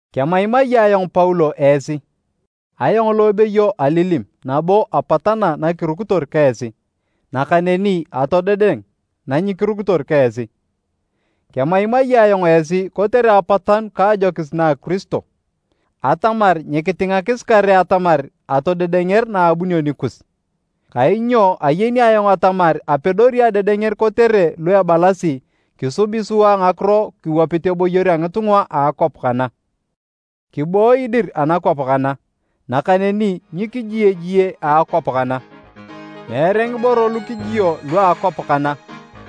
Kemaimai ayong Paulo esi, ayong lo ebeyo alilim nabo apatana nakirukitor ka esi nakaneni atodedeng nanyikirukitor ka esi. Kemaimai ayong esi kotere apatanu ka ajokis na Kiristo atamar nyikitingakis kare atamar atodedenger naabunio nikus, kainyo ayeni ayong atamar apedori adedenger kotere lu ebalasi kisubi sua ngakiro kiwapit eboyor a ngitunga a akwap kana. Kibooyi dir anakwap kana, nakaneni nyikiji ejie a akwap kana. Meere ngiboro lu kijio lua akwap kana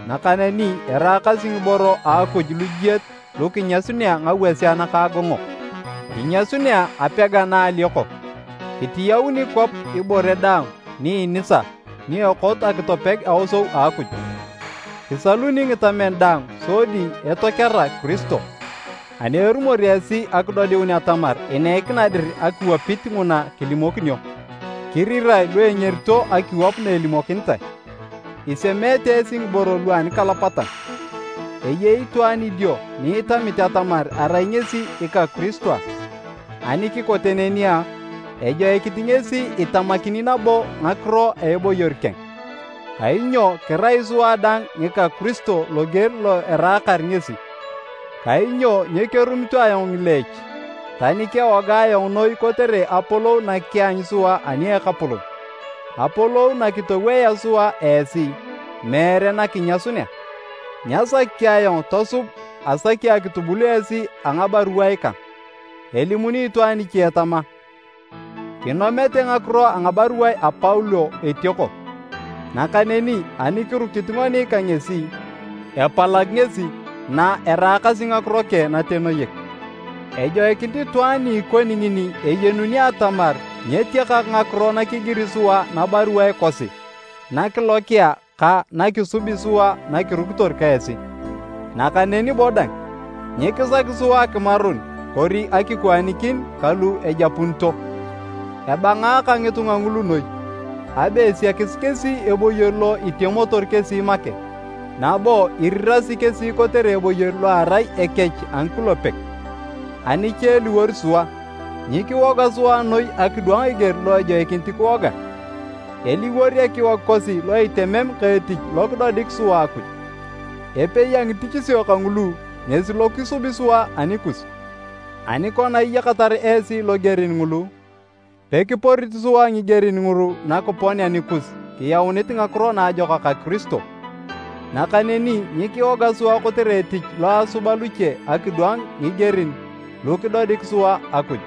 nakaneni eraakasi ngiboro a Akuj lujiet lu kinyasununea ngawasea nakaagongok. Kinyasunea apega na alioko, kitiyauni kwap ibore daang ni inisa ni ekot akitopeg aosou a Akuj, kisaluni ngitamen daang sodi etokera Kiristo. Ani erumor esi akidodiun atamar ineikina dir akiwapit nguna kilimokinio, kirirae lu engerito akiwap na elimokinitae. Isemeete esi ngiboro lua anikalapatan. Eyei itwaan idio ni itamit atamar arai ngesi ika Kiristo a? Ani kikote neni a, ejoikinit ngesi itamakini nabo ngakiro a eboyor keng, kainyo kirai sua dang ngika Kiristo loger lo eraakar ngesi. Kainyo nyekerumito ayong ngileech, tani kewoga ayong noi kotere apolou na kianyu sua ani a Ekapolon, apolou na kitowoea sua esi, meere na kinyasunea. Nyasaki ayong tosub asaki akitubul esi a ngabaruae kang. Elimuni itwaan iche tama, “Kinomete ngakiro a ngabaruae a Paulo etioko, nakaneni ani kirukit ngoni ka ngesi, epalag ngesi na eraakasi ngakiro keng natenoyek.” Ejoikinit itwaan ni ikoni ngini eyenuni atamar nyetiakak ngakiro nakigiri sua nabaruae kosi nakilokia ka nakisubi sua nakirukitor ka esi. Nakaneni bo dang, nyikisaki sua akimarun kori akikwaanikin ka lu ejapunito. Ebangaaka ngitunga ngulu noi! Abe esiakis kesi eboyor lo itemotor kesi make, nabo irirasi kesi kotere eboyor lo erai ekech a ngikulepek! Ani cha eliwor sua, nyikiwoga sua noi akidwang eger lo ejoikinit kiwoga, eliwor ekiwog kosi lo itemem ka etich lo kidodik sua Akuj. Epei a ngitichisio kangulu ngesi lo kisubi sua anikus. Ani kona iyakatar esi logerin ngulu, pekiporit sua ngigerin ngulu nakiponea nikus kiyaunit Ngakiro Naajokak a Kiristo. Nakaneni nyikiwoga sua kotere etich lo asuba luche akidwang ngigerin lu kidodik sua Akuj.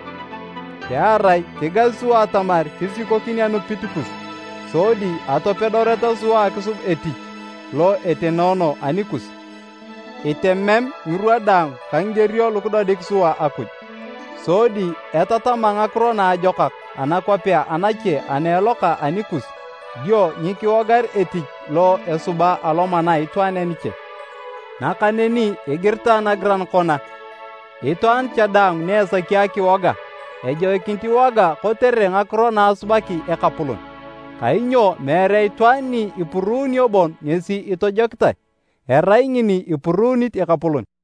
Pearai kigasi sua atamar kisikokin anupit kus sodi atopedoreta sua akisub etich lo etenoono anikus, itemem ngirwa daang ka ngigerio lu kidodik sua Akuj. Sodi etatama Ngakiro Naajokak anakwapea anache ana eloka anikus dio nyikiwogar etich lo esuba alomana a itwaan aniche. Nakaneni igiritae nagiran kona, “Itwaan cha daang ni esaki akiwoga, ejoikinit iwoga kotere ngakiro na asubaki Ekapolon.” Kainyo meere itwaan ni ipuruuno bon ngesi itojokitae, erai ngini ipuruunit Ekapolon.